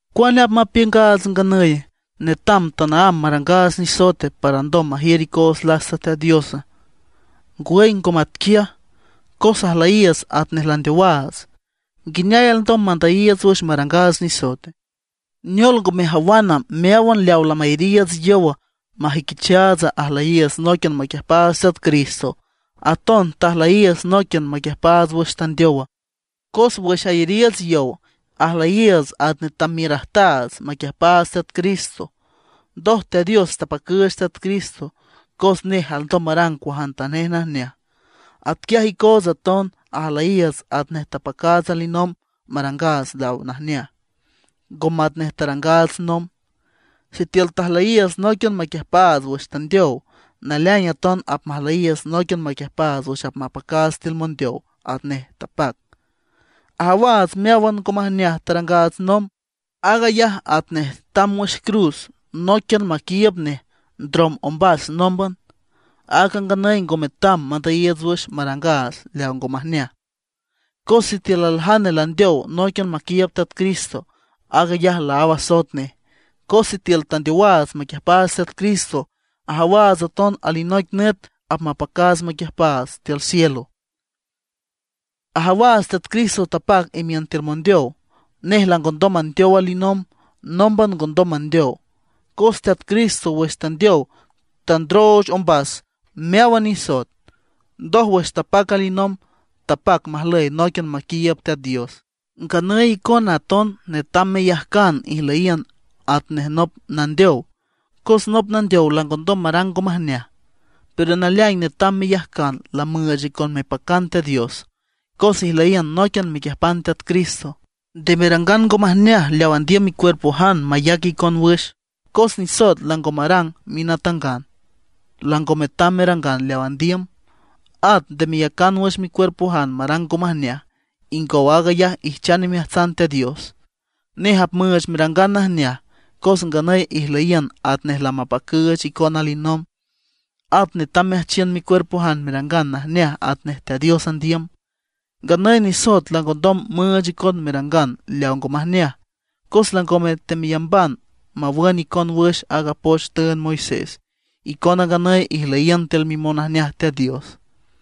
¿Cuane apmapiüngaats nganüye? ¿Netam tanaámb marangaats nisoete para alndom majiür icoots lasta Teat Dios? ¡Ngwüy ngo matquiaj! Cos ajlüyiiüts atnej landeowaats. ¿Nguineay alndom mandüyiiüts wüx marangaats nisoete? ¿Neol ngo mejawana, meáwan leawa lamayariiüts yow, majüiquichaats ajlüyiiüts nóiquian maquiüjpaats Teat Cristo, aton tajlüyiiüts nóiquian maquiüjpaats wüx tandeowa? Cos wüx ayariiüts yow ajlüyiiüts atnej tamiürajtaats maquiüjpaats Teat Cristo. Ndoj Teat Dios tapacüüch Teat Cristo, cos nej alndom marang cuajantanej najneaj. Atquiaj icoots aton ajlüyiiüts atnej tapacaats alinomb marangaats leaw najneaj, ngo matnej tarangaats nomb. Sitiül tajlüyiiüts nóiquian maquiüjpaats wüx tandeow, naleaing aton apmajlüyiiüts nóiquian maquiüjpaats wüx apmapacaats tiül mondeow atnej tapac. Ajawaats meáwan ngo majneaj tarangaats nomb, aag ayaj atnej tamb wüx cruz nóiquian maquiiüb nej ndrom ombas nómban. Aaga nganüy ngo metam mandüyiiüts wüx marangaats leaw ngo majneaj. Cos sitiül aljane landeow nóiquian maquiiüb Teat Cristo aag ayaj laáw asoet nej. Cos sitiül tandeowaats maquiüjpaats Teat Cristo, ajawaats aton alinoic nüt apmapacaats maquiüjpaats tiül cielo. Ajawaats Teat Cristo tapac imiün tiül mondeow, nej langondom mandeow alinomb, nómban ngondom mandeow. Cos Teat Cristo wüx tandeow tandrooch ombas meáwan nisoet, ndoj wüx tapac alinomb, tapac majlüy nóiquian maquiiüb Teat Dios. Nganüy icona aton netam meyajcan ijlüyiün atnej nop nandeow, cos nop nandeow langondom marang ngo majneaj. Pero naleaing netam meyajcan lamüüch icon mepacan Teat Dios, cos ijlüyiün nóiquian mequiüjpan Teat Cristo. Nde merangan ngo majneaj leaw andiüm micuerpojan mayac icon wüx, cos nisoet lango marang minatangan, lango metam merangan leaw andiüm. At nde meyacan wüx micuerpojan marang ngo majneaj; ingow aag ayaj ijchan imeajtsan Teat Dios. Nej apmüüch merangan najneaj, cos nganüy ijlüyiün atnej lamapacüüch icon alinomb. At netam meajchiün micuerpojan merangan najneaj atnej Teat Dios andiüm. Nganüy nisoet langondom müüch icon merangan leaw ngo majneaj, cos langome temeyamban mawün icon wüx aaga poch tüünd Moisés. Icona nganüy ijlüyiün tiül mimonajneaj Teat Dios.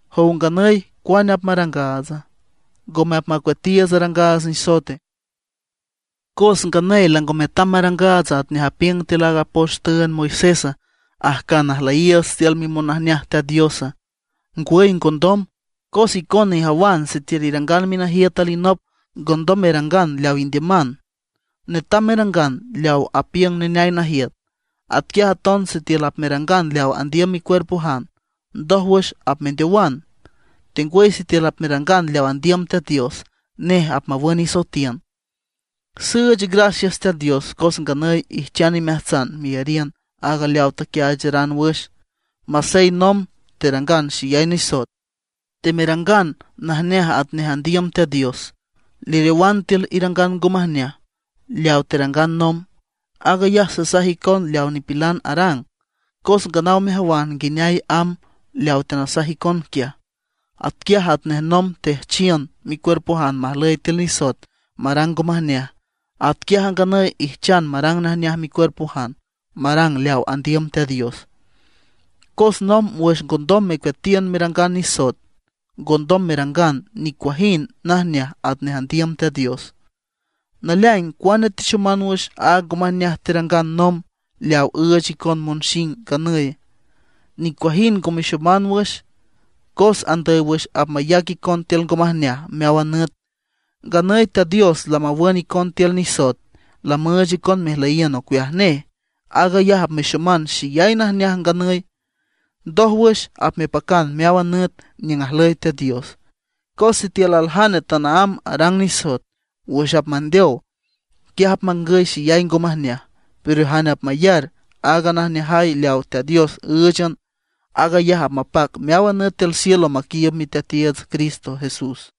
¿Jow nganüy cuane apmarangaatsa? ¿Ngome apmacueatiiüts arangaats nisoete, cos nganüy lango metam marangaats atnej apiüng tiül aaga poch tüünd Moisés ajcan ajlüyiiüts tiül mimonajneaj Teat Diosa? ¡Ngwüy ngondom! Cos icona ijawan sitiül irangan minajiüt alinop ngondom merangan leaw indiüman; netam merangan leaw apiüng neneay najiüt. Atquiaj aton sitiül apmerangan leaw andiüm micuerpojan ndójwüx apmendeowan. Tengwüy sitiül apmerangan leaw andiüm Teat Dios, nej apmawün isoetiün. Süüch gracias Teat Dios, cos nganüy ijchan imeajtsan meyariün aaga leawa tequiaacharanan wüx, masey nomb terangan xeyay nisoet. Temerangan najneaj atnej andiüm Teat Dios; leriowan tiül irangan ngo majneaj leaw terangan nomb. (Aag ayaj sasaj icon leaw nipilan arang, cos nganaw mejawan nguineay amb leaw teanasaj icon quiaj.) Atquiaj atnej nomb teajchiün micuerpojan majlüy tiül nisoet marang ngo majneaj; atquiaj a nganüy ijchan marang najneaj micuerpojan, marang leaw andiüm Teat Dios. Cos nomb wüx ngondom mecueatiün merangan nisoet, ngondom merangan nicuajind najneaj atnej andiüm Teat Dios. ¿Naleaing cuane texoman wüx aaga ngo majneaj terangan nomb leaw üüch icon monxing nganüy? Nicuajind ngo mexoman wüx, cos andüy wüx apmayac icon tiül ngo majneaj meáwan nüt. Nganüy Teat Dios lamawün icon tiül nisoet, lamüüch icon mejlüyiün ocueaj nej. Aag ayaj apmexoman xeyay najneaj nganüy, ndójwüx apmepacan meáwan nüt niüng ajlüy Teat Dios. Cos sitiül aljane tanaámb arang nisoet, wüx apmandeow, quiaj apmangüy xeyay ngo majneaj; pero jane apmayar aaga najneajay leaw Teat Dios ǘüchan, aag ayaj apmapac meáwan nüt tiül cielo maquiiüb Miteatiiüts Cristo Jesús.